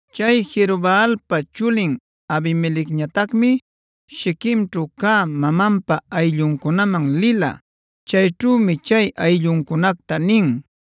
Chay Jerobaalpa chulin Abimelecñatacmi Shiquemćhu cä mamanpa aylluncunaman lila. Chayćhümi chay aylluncunacta nin: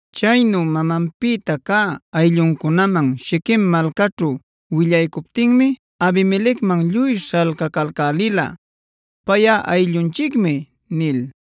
Chaynu mamanpïta cä aylluncunaman Shiquem malcäćhu willaycuptinmi Abimelecman lluy śhalcacalcälila “payꞌa ayllunchicmi” nil.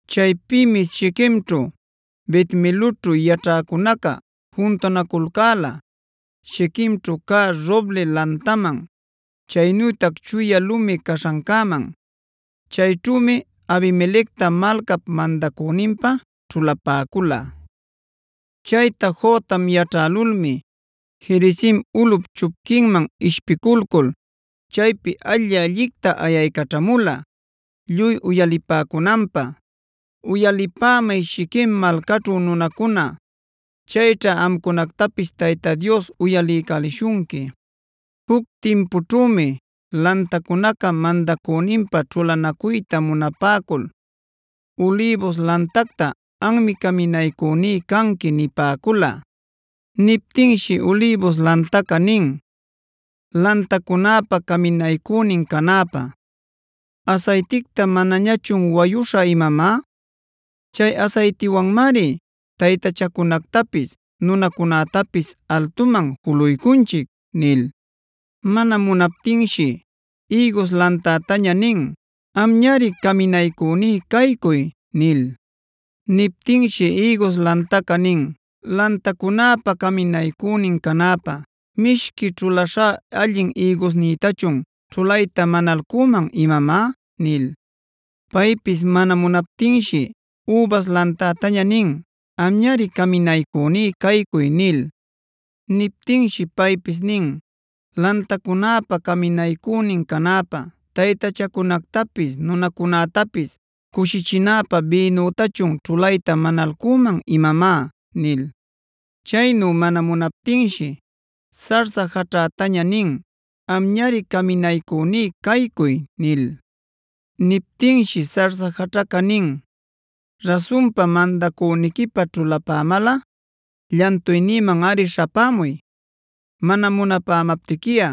Chaypïmi Shiquemćhu, Bet-miloćhu yaćhäcunaca juntunaculcäla Shiquemćhu cä roble lantaman, chaynütac chuya lumi caśhancäman. Chayćhümi Abimelecta malcap mandacüninpä ćhulapäcula. Chayta Jotam yaćhälulmi Gerizim ulꞌup chupquinman ishpiculcul chaypi alli-allicta ayaycaćhamula lluy uyalipäcunanpä: “Uyalipämay Shiquem malcaćhu nunacuna; chayćha amcunactapis Tayta Dios uyaliycälishunqui. Juc timpućhümi lantacunaca mandacüninpä ćhulanacuyta munapäcul ulïbus lantacta: ‘Anmi caminaycüní canqui’ nipäcula. Niptinshi ulïbus lantaca nin: ‘Lantacunäpa caminaycünin canäpä, ¿asayticta manañachun wayuśhä imamá? Chay asaytiwanmari taytachacunactapis nunacunätapis altuman juluycunchic’ nil. “Mana munaptinshi ïgus lantätaña nin: ‘Amñari caminaycüní caycuy’ nil. Niptinshi ïgus lantaca nin: ‘Lantacunäpa caminaycünin canäpä ¿mishqui ćhulaśhá allin ïgusnïtachun ćhulayta manalcüman imamá?’ nil. “Paypis mana munaptinshi übas lantätaña nin: ‘Amñari caminaycüní caycuy’ nil. Niptinshi paypis nin: ‘Lantacunäpa caminaycünin canäpä ¿taytachacunactapis, nunacunätapis cushichinäpä bïnütachun ćhulayta manalcüman imamá?’ nil. “Chaynu mana munaptinshi zarza jaćhätaña nin: ‘Amñari caminaycüní caycuy’ nil. Niptinshi zarza jaćhaca nin: ‘Rasunpa mandacüniquipä ćhulapämalꞌa llantuynïmanꞌari śhapämuy. Mana munapämaptiquiꞌa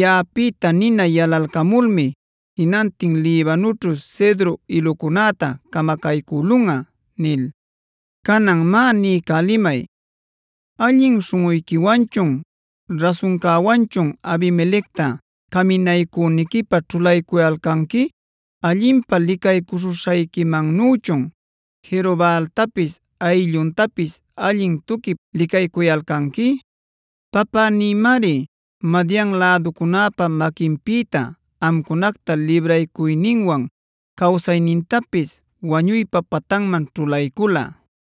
yaꞌapïta nina yalalcamulmi jinantin Libanoćhu cedro ilucunäta camacaycülunꞌa’ nil. “Canan má niycälimay: ¿Allin śhunꞌuyquiwanchun, rasuncäwanchun Abimelecta caminaycüniquipä ćhulaycuyalcanqui? ¿Allinpa licaycuśhuśhayquimannüchun Jerobaaltapis aylluntapis allin tuquip licaycuyalcanqui? Papänïmari Madian läducunäpa maquinpïta amcunacta libraycuyninwan cawsaynintapis wañuypa patanman ćhulaycula.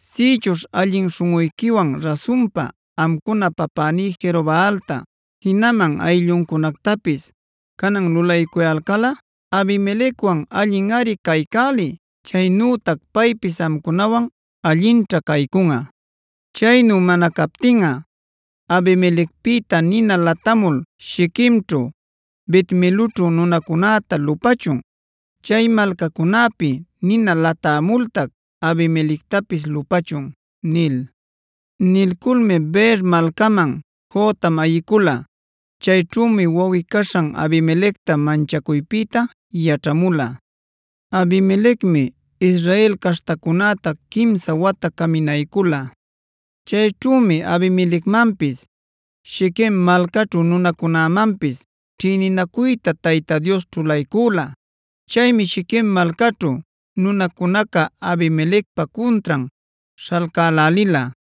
Sïchuśh allin śhunꞌuyquiwan, rasunpa amcuna papäní Jerobaalta, jinaman aylluncunactapis canan lulaycuyalcalꞌa, Abimelecwan allinꞌari caycäliy; chaynutac paypis amcunawan allinćha caycunꞌa. Chaynu mana captinꞌa Abimelecpïta nina latämul Shiquemćhu, Bet-miloćhu nunacunäta lupächun. Chay malcacunäpi nina latämultac Abimelectapis lupächun” nil. Nilculmi Beer malcäman Jotam ayicula. Chayćhümi wawꞌi-caśhan Abimelecta manchacuypïta yaćhamula. Abimelecmi Israel caśhtacunäta quimsa wata caminaycula. Chayćhümi Abimelecmanpis, Shiquem malcaćhu nunacunämanpis ćhïninacuyta Tayta Dios ćhulaycüla. Chaymi Shiquem malcaćhu nunacunaca Abimelecpa cuntran śhalcälälila.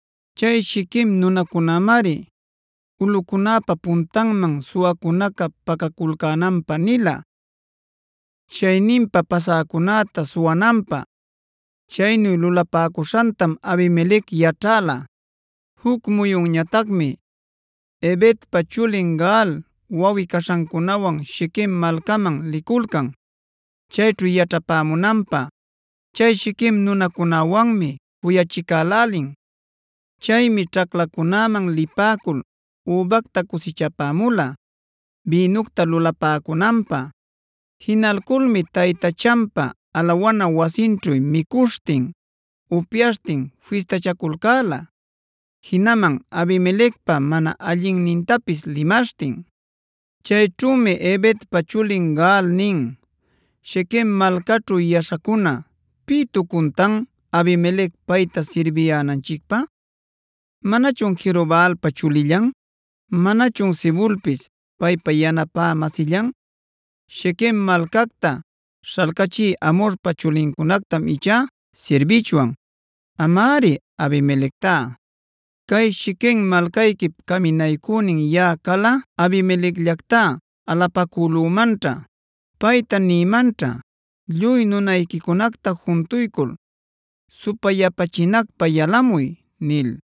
Chay Shiquem nunacunämari ulꞌucunäpa puntanman suwacunaca pacaculcänanpä nila, chayninpa pasäcunäta suwananpä. Chaynu lulapäcuśhantam Abimelec yaćhäla. Juc muyunñatacmi Ebedpa chulin Gaal, wawꞌi-caśhancunawan Shiquem malcaman liculcan chayćhu yaćhapämunanpä. Chay Shiquem nunacunäwanmi cuyachicälälin. Chaymi ćhaclacunäman lipäcul übacta cusichapämula bïnucta lulapäcunanpä. Jinalculmi taytachanpa alawana wasinćhu micuśhtin, upyaśhtin fistachaculcäla, jinaman Abimelecpa mana allinnintapis limaśhtin. Chayćhümi Ebedpa chulin Gaal nin: “Shiquem malcaćhu yaćhäcuna, ¿pïtucuntan Abimelec payta sirbiyänanchicpä? ¿Manachun Jerobaalpa chulillan? ¿Manachun Zebulpis paypa yanapä-masillan? Shiquem malcacta śhalcachï Hamorpa chulincunactam ichá sirbichwan; amari Abimelectá. Cay Shiquem malcayquip caminaycünin yaꞌa calꞌa Abimelecllactá alapacülümanćha. Payta nïmanćha: ‘Lluy nunayquicunacta juntuycul supayapachinacpä yalamuy’” nil.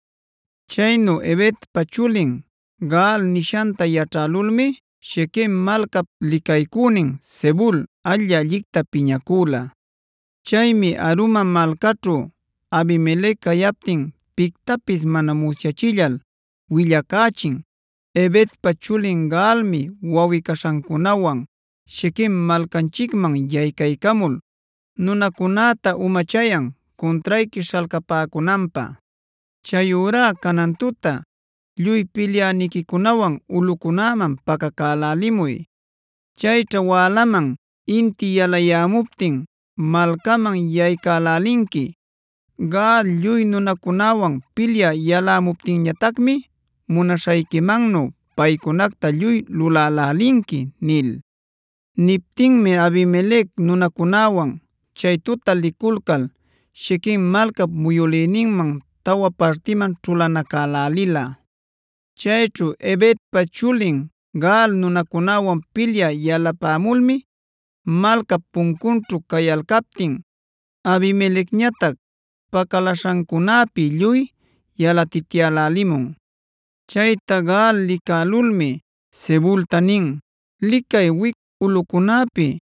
Chaynu Ebedpa chulin Gaal nishanta yaćhälulmi Shiquem malcap licaycünin Zebul alli-allicta piñacüla. Chaymi Aruma malcaćhu Abimelec cayaptin pictapis mana musyachillal willacächin: “Ebedpa chulin Gaalmi wawꞌi-caśhancunawan Shiquem malcanchicman yaycaycamul nunacunäta umachayan cuntrayqui śhalcapäcunanpä. Chayurá canan tuta lluy pilyäniquicunawan ulꞌucunäman pacacälälimuy. Chayćha wälaman inti yalayämuptin malcaman yaycälälinqui. Gaal lluy nunancunawan pilyä yalamuptinñatacmi munaśhayquimannu paycunacta lluy lulälälinqui” nil. Niptinmi Abimelec nunancunawan chay tuta liculcal Shiquem malcap muyülïninman tawa partiman ćhulanacälälila. Chayćhu Ebedpa chulin Gaal nunancunawan pilyä yalapämulmi malcap puncunćhu cayalcaptin, Abimelecñatac pacaläśhancunäpi lluy yalatityalälimun. Chayta Gaal licälulmi Zebulta nin: “Licay, wic ulꞌucunäpi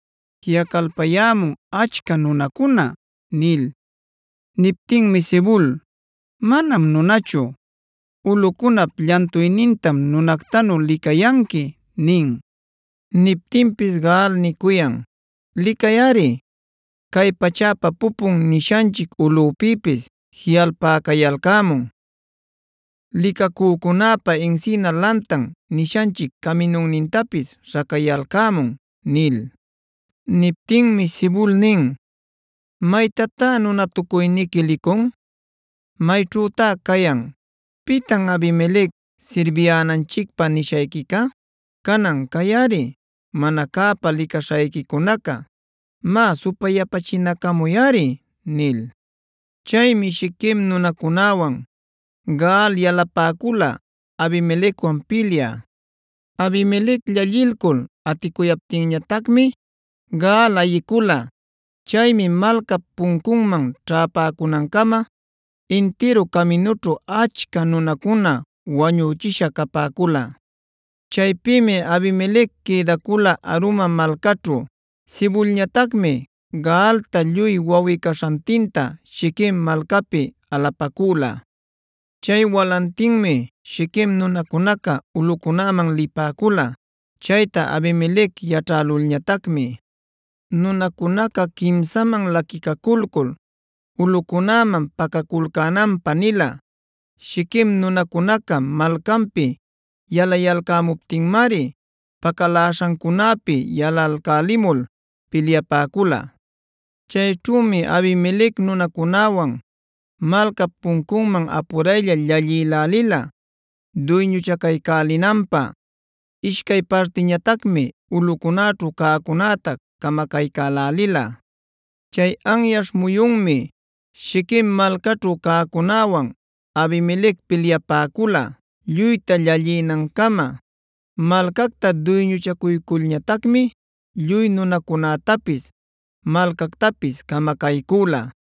jiꞌalpacayämun achca nunacuna” nil. Niptinmi Zebul: “Manam nunachu. Ulꞌucunap llantuynintam nunactanu licayanqui” nin. Niptinpis Gaal nicuyan: “Licayꞌari. ‘Cay pachäpa pupun’ nishanchic ulꞌupïpis jiꞌalpacayalcämun. ‘Licacücunäpa encina lantan’ nishanchic caminunnintapis śhacayalcämun” nil. Niptinmi Zebul nin: “¿¡Maytatá nunatucuyniqui licun!? Mayćhütá cayan, ‘¿pitan Abimelec sirbiyänanchicpä’ nishayquica? Canan cayꞌari mana cäpa licaśhayquicunaca. Má supayapachinacamuyꞌari” nil. Chaymi Shiquem nunacunäwan Gaal yalapäcula Abimelecwan pilyä. Abimelec llallilcul aticuyaptinñatacmi Gaal ayicula. Chaymi malcap puncunman ćhäpäcunancama intiru caminućhu achca nunacuna wañüchisha cäpäcula. Chaypïmi Abimelec quïdacula Aruma malcaćhu. Zebulñatacmi Gaalta lluy wawꞌi-caśhantinta Shiquem malcapi alapacüla. Chay walantinmi Shiquem nunacunaca ulꞌucunäman lipäcula. Chayta Abimelec yaćhälulñatacmi, nunancunacta quimsaman laquilcul ulꞌucunäman pacaculcänanpä nila. Shiquem nunacunaca malcanpi yalayalcämuptinmari pacaläśhancunäpi yalalcälimul pilyapäcula. Chayćhümi Abimelec nunancunawan malcap puncunman apuraylla llallïlälila duyñuchacaycälinanpä. Ishcay partïñatacmi ulꞌucunäćhu cäcunäta camacaycälälila. Chay anyaśh muyunmi Shiquem malcaćhu cäcunäwan Abimelec pilyapäcula, lluyta llallinancama. Malcacta duyñuchacuyculñatacmi lluy nunacunätapis, malcactapis camacaycüla.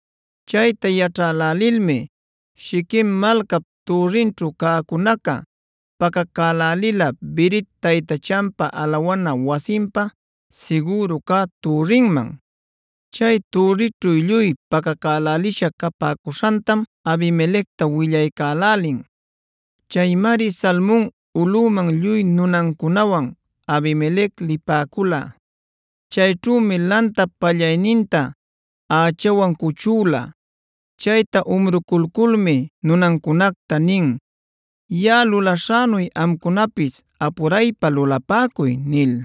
Chayta yaćhälälilmi Shiquem malcap türrinćhu cäcunaca, pacacälälila Berit taytachanpa alawana wasinpa sigüru cä türrinman. Chay türrićhu lluy pacacälälisha capäcuśhantam Abimelecta willaycälälin. Chaymari Salmon ulꞌuman lluy nunancunawan Abimelec lipäcula. Chayćhümi lantap pallayninta ächawan cuchüla. Chayta umruculculmi nunancunacta nin: “Yaꞌa lulaśhänu amcunapis apuray lulapäcuy” nil.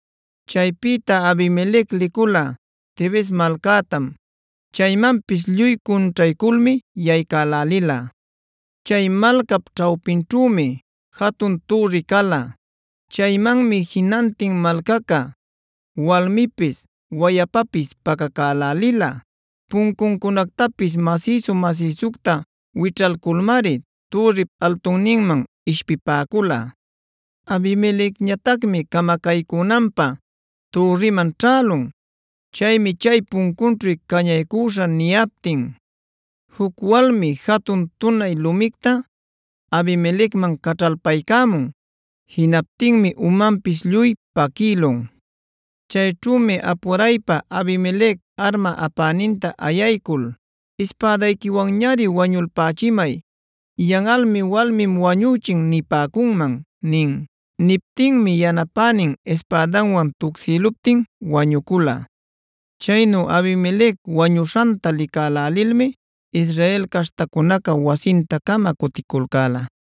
Chaypïta Abimelec licula Tebes malcätam. Chaymanpis lluy cunćhayculmi yaycälälila. Chay malcap ćhawpinćhümi jatun türri cala. Chaymanmi jinantin malcaca walmipis, wayapapis pacacälälila. Puncuncunactapis masïsu-masïsucta wićhalculmari türrip altunninman ishpipäcula. Abimelecñatacmi camacaycünanpä türriman ćhälun. Chaymi chay puncunćhu cañaycüśhä niyaptin, juc walmi jatun tunay lumicta Abimelecman caćhalpaycämun. Jinaptinmi umantapis lluy paquïlun. Chayćhümi apuraypa Abimelec arma apäninta ayaycul: “Ispädayquiwanñari wañulpächimay. Yanꞌalmi ‘walmim wañüchin’ nipäcunman” nin. Niptinmi yanapänin ispädanwan tucsïluptin wañucula. Chaynu Abimelec wañuśhanta licälälilmi Israel caśhtacunaca wasinta-cama cuticulcäla.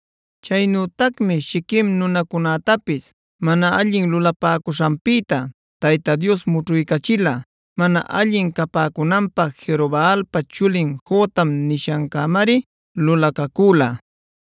Chaynütacmi Shiquem nunacunätapis mana allin lulapäcushanpïta Tayta Dios mućhuycachila. Mana allin capäcunanpä Jerobaalpa chulin Jotam nishancämari lulacacüla.